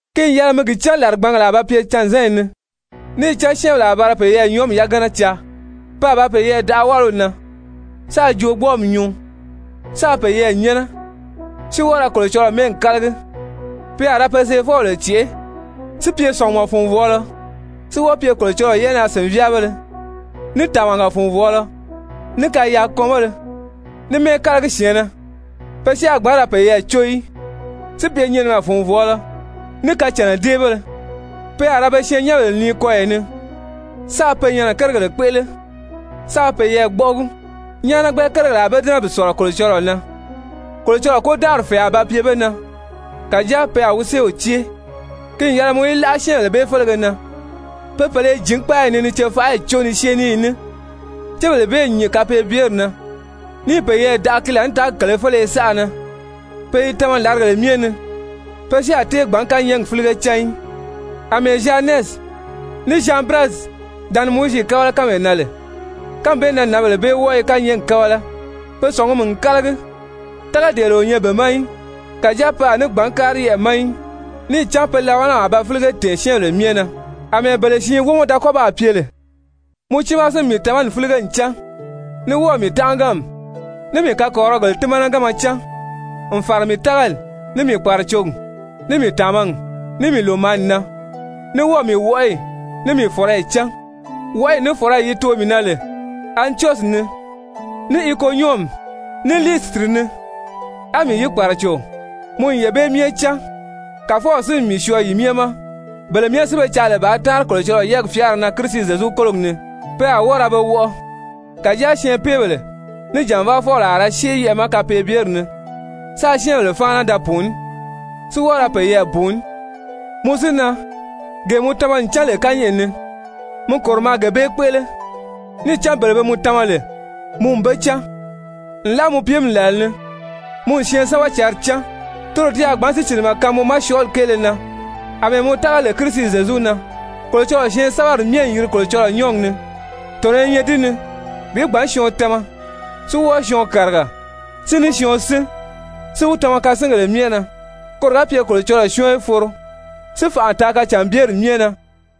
Ki n yɛlɛ mi gi cán làrigbangèle a ba pye canzanyi ni. Níì cán syɛ́ɛnbèle a ba ra peyɛɛ nyɔɔmi yagana caa, pe a ba peyɛɛ daʔa wáliw na, sáā joogbɔɔmi nyuu, sáā peyɛɛ nyɛ́nɛ, si wɔ́ɔ ra Kolocɔlɔɔ mɛ́ɛgi kálagi, pe a ra pe seefɔbèle cèʔé, si pye sɔ̀ngumɔ-fùnvɔɔlɔ, si wɔ́ɔ pye Kolocɔlɔɔ yɛ́ʔɛnaa-sìnvyaabéle, ní tàmaga-fùnvɔɔlɔ, ní kayaakɔnbéle, ní mɛ́ɛkalagi-syɛ̀ɛnnɛ, pe si a gbǎn ra peyɛɛ có í, si pye nyinimɛ-fùnvɔɔlɔ, ní kacànnadeebéle, pe a ra be syɛɛnnyɛnbèle nii kɔyɔ ni, sáā pe nyɛnɛ kérigèle kpéʔele, sáā peyɛɛ gbɔ́ʔɔgi, nyáanagbɛ kérigèle a be dɛ́nɛ bi sɔ̀lɔ Kolocɔlɔɔ na. Kolocɔlɔɔ kôdanʔari fɛ̀ɛ a ba pye be na, kàjáa pe a wi séew cée. Ki n yɛlɛ mɔ í láʔa syɛ́ɛnbèle bee félege na. Pe pèle i jǐn kpáayi ni ni cefaʔayi có ni syée ní yi ní, cébèle bee n nyìn kapeebyeri na, níì peyɛɛ daʔa ki laànitaagi kèlē féleye saʔa na. Pe i tama làrigèle myɛ ni, pe si a tée gbǎn kányɛɛgi fílige cán í. Amɛɛ Zyanɛsi ní Zyanbirɛsi da ni Mowizi kábala kánmee na lè, kánmi bee na nǎnbèle bee wɔ́ɔ i kányɛɛgi kábala. Pe sɔ̀ngumi n kálagi, tágadeele o nyɛ be ma í. Kàjáa pe a ní gbǎn kári yɛʔɛ̀ ma í, níì cán pe labalami a ba fílige tɛ̀ɛn syɛ́ɛnbèle myɛ na àmɛɛ bele siin wómɔ da kɔ́ baa pye lè. Mɔ tiimaa si n mii tamani fílige n cán, ní wɔ́ɔ̀ mii tánʔaganmi, ní mii kakɔrirɔgèle tímanaganma cán, n fàra mii tágali, ní mii kpàracogi, ní mii tàmagi, ní mii lòmaani na, ní wɔ́ɔ̀ mii wɔʔɔyi, ní mii fɔ̀rɔyi cán. Wɔʔɔyi ní fɔ̀rɔyi yi too mii na lè Antyɔsyi ni, ní Ikonyɔmi, ní Liisitiri ni, á mii yi kpàraco, mɔ n yee bee myɛ cán. Kàfɔw si n mii syɔɔ yi myɛ ma. Bele myɛ si be caa lè bàā táanri Kolocɔlɔɔ yɛ́ɛgi fyáara na Kirisi Zyezu kólogi ni, pe a wɔ́ɔ ra be wɔʔɔ. Kàjáa syɛɛnpeebèle ní jànvaafɔbèle a ra syée yɛʔɛ̀ ma kapeebyeri ni, sáā syɛ́ɛnbèle fáana da pùuní, si wɔ́ɔ ra peyɛɛ bùuní. Mɔ si na, gee mɔ tama n cán lè kányɛʔɛ ni, mi kòro maa gee bee kpéʔele. Níì cán bele be mɔ tama lè, mɔ n be cán. Nlaa mɔ piimi làla ni mɔ n syɛɛnsɛbɛcǎnri cán. Toro ti a gbǎn sícilimɛ kaan mɔ ma syɔɔli kéele na àmɛɛ mɔ tága lè Kirisi Zyezu na. Kolocɔlɔɔ syɛɛnsɛbɛri myɛ n yiri Kolocɔlɔɔ nyɔ́ɔgi ni, tɔ̀nɔ i nyɛ di ni bi gbǎn syɔɔn tama, si wɔ́ɔ syɔɔn kàriga, si ní syɔɔn sín, si wi tama kasingèle myɛ na, koro ga pye Kolocɔlɔɔ syɔ́ɔn í foro si fànʔa taa kacànbyeri myɛ na.